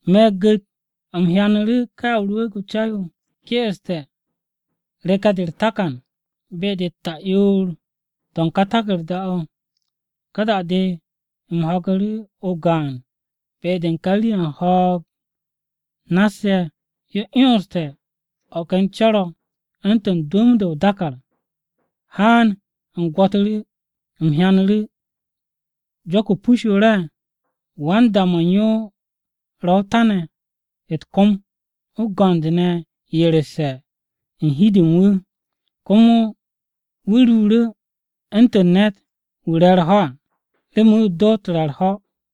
Me̱ gu̱t, u̱m hyanu̱ru̱ ká Ya o-Rwu̱u̱g o-Ca yo ke'este̱ reke̱-de u̱r-takan be-de u̱t-ta'yoor to̱ u̱n ká taku̱rda-o̱. Ka da-de u̱m ho̱gu̱ru̱ o-gaan be-de u̱n ka rii-ye̱ u̱n ho̱o̱g nass-ye̱ yo 'yonste̱ o̱ ken co̱r-o̱ u̱ntu̱n dwu̱m-de o-dàkàr, “Haan!” U̱m gwo̱tu̱ru̱, u̱m hyanu̱ru̱ jo̱k-o pus-yo re̱e̱. Wan-da-mo̱ u̱n yo ro o-ta ne̱ u̱t-kom, o-go̱nd ne̱ yeresse̱ u̱n hi-de u̱n wu̱. Komo wu̱ ruuru̱ u̱ntu̱n ne̱t-wu̱ re̱ u̱r-ho̱ à remen wu̱ doot re̱ u̱r-ho̱.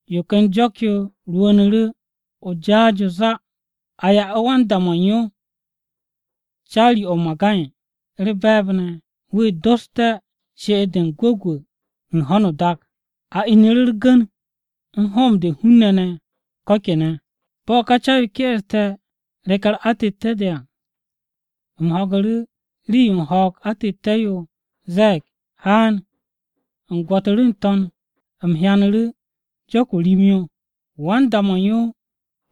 Yo ken jo̱k-yo rwu̱u̱nu̱ru̱ o-jaas yo záá. A ya'u̱ wan-da-mo̱ u̱n yo caari-o̱ o-magay u̱r-be̱e̱b ne̱ wu̱ dosté̱ she'et-de m-gwu̱gwu̱ u̱n ho̱no o-dak, a inu̱ru̱ u̱r-gu̱n u̱n hoom-de u̱n hun-ne̱ ne̱ ko̱ kene̱. Bo̱ ká Ca-yo ke'este̱ reke̱-u̱r atette̱-de à, u̱m ho̱gu̱ru̱ rii-yo u̱n ho̱o̱g o-atette̱-yo ze̱e̱g, “Haan!” U̱m gwo̱tu̱ru̱ n-to̱n, u̱m hyanu̱ru̱ jo̱k-o rim-yo. Wan-da-mo̱ u̱n yo̱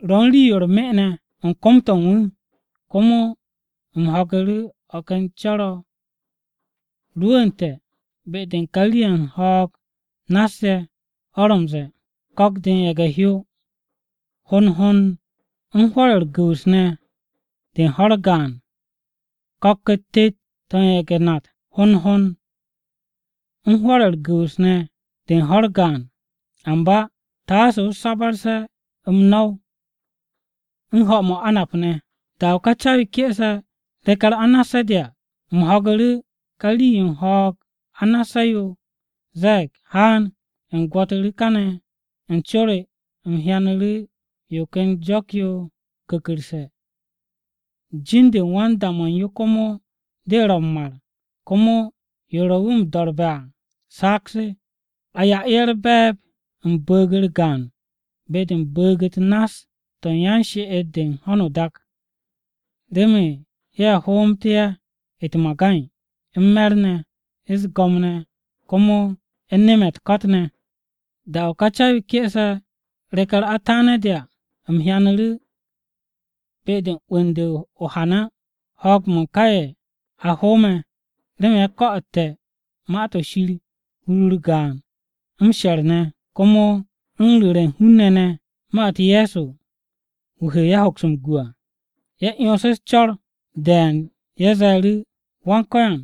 ro̱ u̱n rii-yo u̱r-me ne̱ u̱n kom-to̱ u̱n wu̱. Komo u̱m ho̱gu̱ru̱ o̱ ken co̱r-o̱ rwu̱u̱nte̱ be-de u̱n ka rii-ye̱ u̱n ho̱o̱g nass-ye̱ o̱ ro̱ m-ze̱e̱, “Ko̱k-de u̱n ye̱ge̱-hyò hond hond u̱n hwo̱r-ye̱ u̱r-gu̱wu̱s de u̱n ho̱-u̱r gaan ne̱. Ko̱k-u̱t tet-to̱ u̱n ye̱ge̱-nat hond hond u̱n hwo̱r-ye̱ u̱r-gu̱wu̱s de u̱n ho̱-u̱r gaan ne̱. Amba taase o sabarse̱ m-no̱w u̱n m-mo̱di ne̱ á.” Da-o̱ ká Ya o-Rwu̱u̱g o-Ca yo ke'ese̱ reke̱-u̱r anasse̱-de à, u̱m ho̱gu̱ru̱ ka rii-yo u̱n ho̱o̱g anasse̱-yo ze̱e̱g, “Haan!” U̱m gwo̱tu̱ru̱ kane̱ u̱n co re. U̱m hyanu̱ru̱ yo ken jo̱k-yo ku̱ku̱rse̱. Jin-de u̱n wan-da-mo̱ u̱n yo komo de ro̱ “m-Mar,” komo yo ro wu̱ m-do̱rbe̱ à “Saag-se.” A ya'u̱ ye̱ u̱r-be̱e̱b u̱n bu̱u̱g-u̱r gaan be-de u̱n bu̱u̱g-u̱t nass-to̱ u̱n yan-she'et-de u̱n ho̱no o-dak, remen ye̱ hoomté̱ ye̱ u̱t-magay, u̱n me̱r ne̱, u̱s-go̱m ne̱, komo u̱n nem-ye̱ u̱t-ko̱t ne̱. Da-o̱ ká Ya o-Rwu̱u̱g o-Ca yo ke'ese̱ reke̱-u̱r ataane̱-de à, u̱m hyanu̱ru̱ be-de u̱n 'wu̱n-de o-hana ho̱o̱g-mo̱ u̱n ka ye̱ a hoome̱ remen ye̱ ko̱'o̱tte̱ Ma-to̱ Shir hur-u̱r gaan m-she̱r ne̱, komo u̱n ru̱re̱ u̱n hun-ne̱ ne̱ ma-u̱t Ye̱so wu̱ he ye̱ hoks m-gu à. Ye̱ 'yonsu̱ u̱s-co̱r de̱e̱n ye̱ ze̱e̱ru̱, “Wan-Ko̱yan,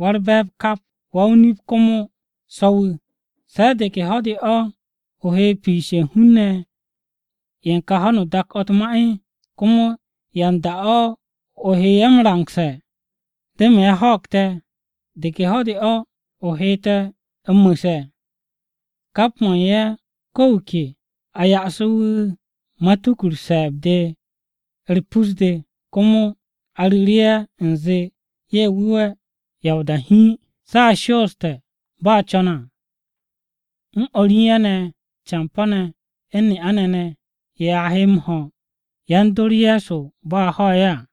Wa-u̱r-Be̱e̱b kap, Wa-o-nip komo So̱-wu̱, ¿se̱ de ke ho̱-de o he piishe̱ u̱n hun-ne̱ ye̱ u̱n kà ho̱no o-dak o̱ u̱t-ma? ¿Komo yan da-o̱ o he ye̱ m-rangse̱ remen ye̱ ho̱o̱g te̱? ¿De ke ho̱-de o he te̱ m-mu̱se̱?” Kap mo̱ u̱n ye̱ ko̱ wu̱ ke a ya'su̱ru̱ wu̱ matuku-u̱r se̱e̱b-de u̱r-pus-de. Komo a ru̱ru̱ ye̱ u̱nze ye̱ wu̱we̱ ya o-da hiin, se̱ a shooste̱ bo̱ a co̱ne̱ à, u̱n o̱r u̱n ye̱ ne̱ campo̱-ne̱ u̱n ne'a-ne̱ ne̱ ye̱ a he m-ho̱ yan-dor Ye̱so bo̱ a ho̱ ye̱ à.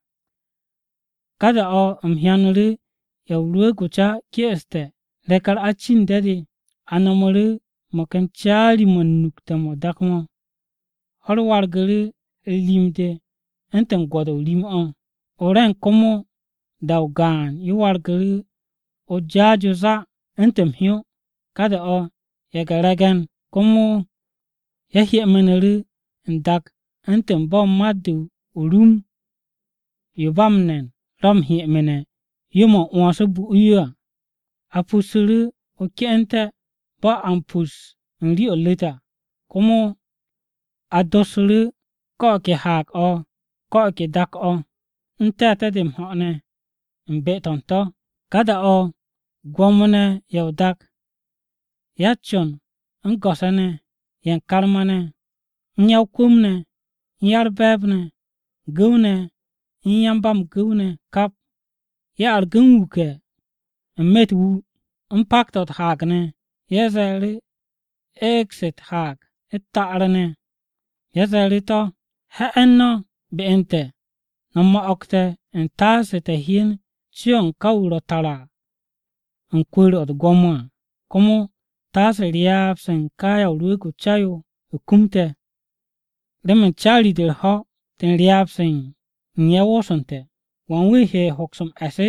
Ka da-o̱ u̱m hyanu̱ru̱ Ya o-Rwu̱u̱g o-Ca ke'este̱ reke̱-u̱r acinde̱-de. A no̱mu̱ru̱ mo̱ ken caari-mo̱ u̱n nukte̱-mo̱ o-dak mo̱. Ho̱-u̱r wargu̱ru̱ u̱r-rim-de u̱ntu̱n gwo̱do̱-o rim-o̱, o-re̱ng komo da-o gaan-yo wargu̱ru̱ o-jaas yo záá u̱ntu̱n m-hyó. Ka da-o̱ ye̱ge̱-re̱ge̱n komo ye̱ hyemenu̱ru̱ n-dak u̱ntu̱n bo̱ mat-de o-rum yo ba m-ne̱n ro̱ m-hyemene̱ yo-mo̱ m-'wo̱ns bu'u̱ yo à. A pussu̱ru̱ o-ke'ente̱ bo̱ a m-pus u̱n rii-o̱ u̱r-ru̱t à, komo a dossu̱ru̱ ko̱ o̱ ke haag-o̱ u̱n ko̱ o̱ ke dak-o̱ n-te̱te̱ de m-ho̱ o̱ ne̱ u̱n be-to̱ u̱n to̱. Ka da-o̱ gwo̱mo-ne̱ ye̱ o-dak, ya-u̱t-con u̱n go̱s-ye̱ ne̱, ye̱ u̱n karma-ne̱, u̱n ya-o-kwu̱m ne̱, u̱n ya-u̱r-be̱e̱b ne̱, gu̱w-ne̱ u̱n yan-ba-m-gu̱w ne̱ ne̱ kap, ye̱ argu̱ m-wuke̱ n-me̱ u̱t-wu, u̱n pak-to̱ u̱t-haag ne̱. Ye̱ ze̱e̱ru̱ eeg-se u̱t-haag u̱t-ta'ar ne̱, ye̱ ze̱e̱ru̱ to̱, “He̱'e̱n no̱ be u̱n te̱ no̱ mo̱'o̱g te̱ u̱ntaase te̱ hyen co-o̱ u̱n ka wu̱ ro̱ tara u̱n kwu̱u̱r-o̱ u̱t-gwo̱mo à, komo taase ryaab-se u̱n ká Ya o-Rwu̱u̱g o-Ca yo kum te̱. Remen caari-de u̱r-ho̱ de u̱n ryaab-se u̱n ye̱ woosu̱nte̱, ¿wan wu̱ he hoks m-e̱s?”